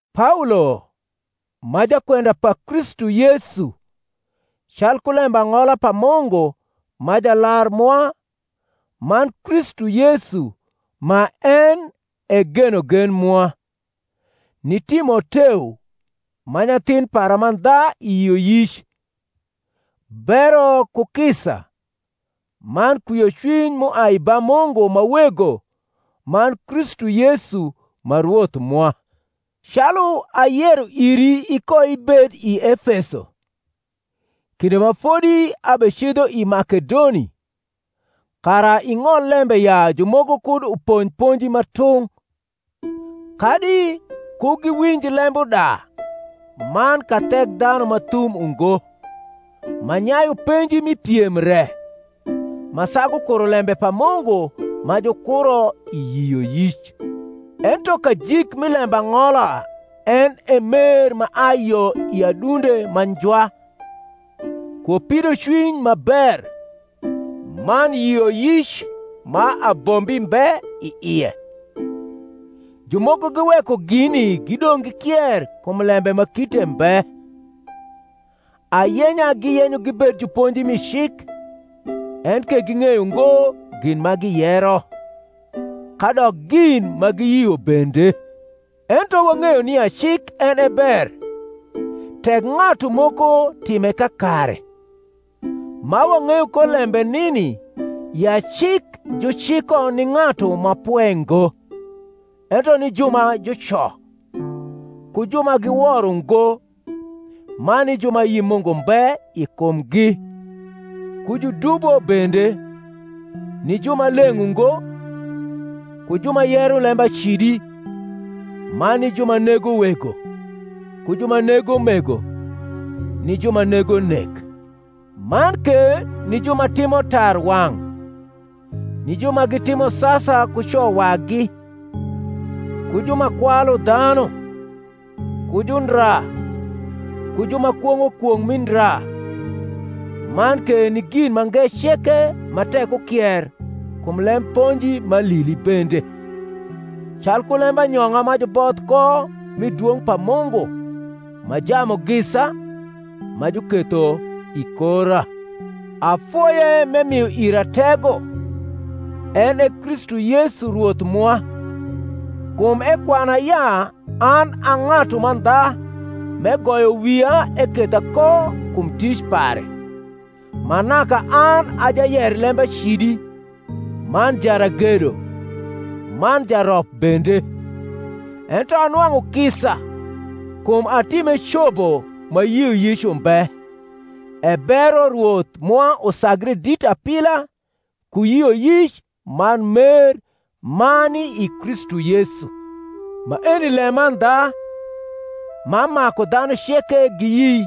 Paolo, ma jakwenda pa Kristu Yesu calku lembang’ola pa Mungu ma Jalar mwa, man Kristu Yesu ma en e genogen mwa; ni Timoteo, ma nyathin para mandha i yioyic: Bero, ku kisa, man kwiocwiny m’uai ba Mungu ma Wego man Kristu Yesu ma Rwoth mwa. Calu ayero iri ikoibed i Efeso, kinde ma fodi abecidho i Makedoni, kara ing’ol lembe ya jumoko kud uponj ponji ma tung’, kadi ku giwinj lembuda man kathekdhanu ma thum ungo, ma nyayu penji mi piem re, ma sagu kuro lembe pa Mungu ma jukuro i yioyic. Ento kajik mi lembang’ola en e mer ma ai yo i adunde ma njwa, ku pidocwiny ma ber, man yioyic ma abombi mbe i ie: jumoko giweko gini gidong’ gikier kum lembe ma kite mbe; ayenya giyenyo gibed juponji mi cik, enke ging’eyo ngo gin ma giyero, kadok gin ma giyio bende. Ento wang’eyo nia cik en e ber, tek ng’atu moko time kakare, ma wang’eyo ko lembe nini, ya cik juciko ni ng’atu ma pwe ngo, ento ni ju ma juco, ku ju ma giwor ungo, man ni ju ma ayi Mungu mbe i kumgi, ku judubo bende, ni ju ma leng’ ungo, ku ju ma yero lembacidi, man ni ju ma nego wego, ku ju ma nego mego, ni ju ma nego nek, man ke ni ju ma timo tarwang’, ni ju ma gitimo sasa ku co wagi, ku ju ma kwalu dhanu, ku jundra, ku ju ma kwong’o kwong’ mi ndra, man ke ni gin mange ceke ma tek ukier kum lem ponji m’alili bende; calku lembanyong’a ma juboth ko mi dwong’ pa Mungu ma Jamugisa, ma juketho i kora. Afoye m’emio ira tego, en e Kristu Yesu Rwoth mwa, kum ekwana ya an a ng’atu mandha m’egoyo wia eketha ko kum tic pare; ma naka an a jayer lembacidi, man jaragedo, man jarop bende: ento anwang’u kisa, kum atime cobo ma yioyic umbe; e bero Rwoth mwa usagre dit apila ku yioyic man mer ma ni i Kristu Yesu. Maeni lemandha, ma maku dhanu ceke giyi,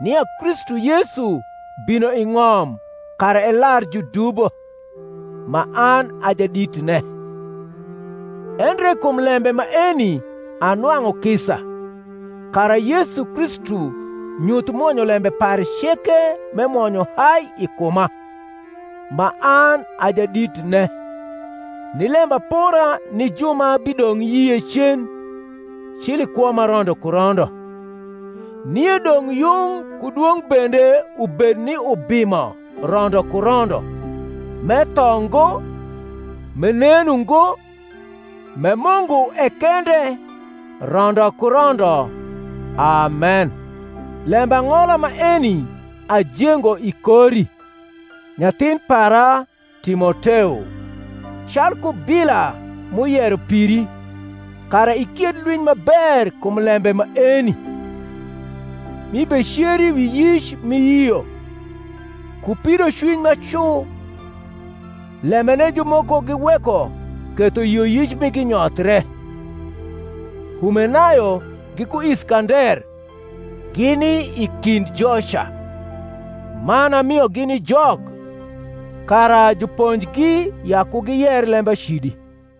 nia Kristu Yesu bino i ng’om kara elar judubo; ma an a jaditne: endre kum lembe maeni anwang’u kisa, kara Yesu Kristu nyuth mwonyolembe pare ceke m’emwonyo hai i kuma, ma an a jaditne, ni lembapora ni ju ma bidong’ yie cen, cil i kwo ma rondo ku rondo. Nie dong’ yung ku dwong’ bende ubed ni Ubimo rondo ku rondo, m’etho ngo, m’enen ungo, m’e Mungu e kende, rondo ku rondo. Amen. Lembang’ola maeni ajengo i kori, nyathin para Timoteo, calku bila m’uyero piri, kara ikied lwiny ma ber kum lembe maeni; m’ibeceri wi yic m’iyio, ku pidocwiny ma cu; lembene jumoko giweko ketho yioyic migi nyothre: Humenayo giku Iskander gini i kind joca; man amiogi ni Jok, kara juponjgi ya ku giyer lembacidi.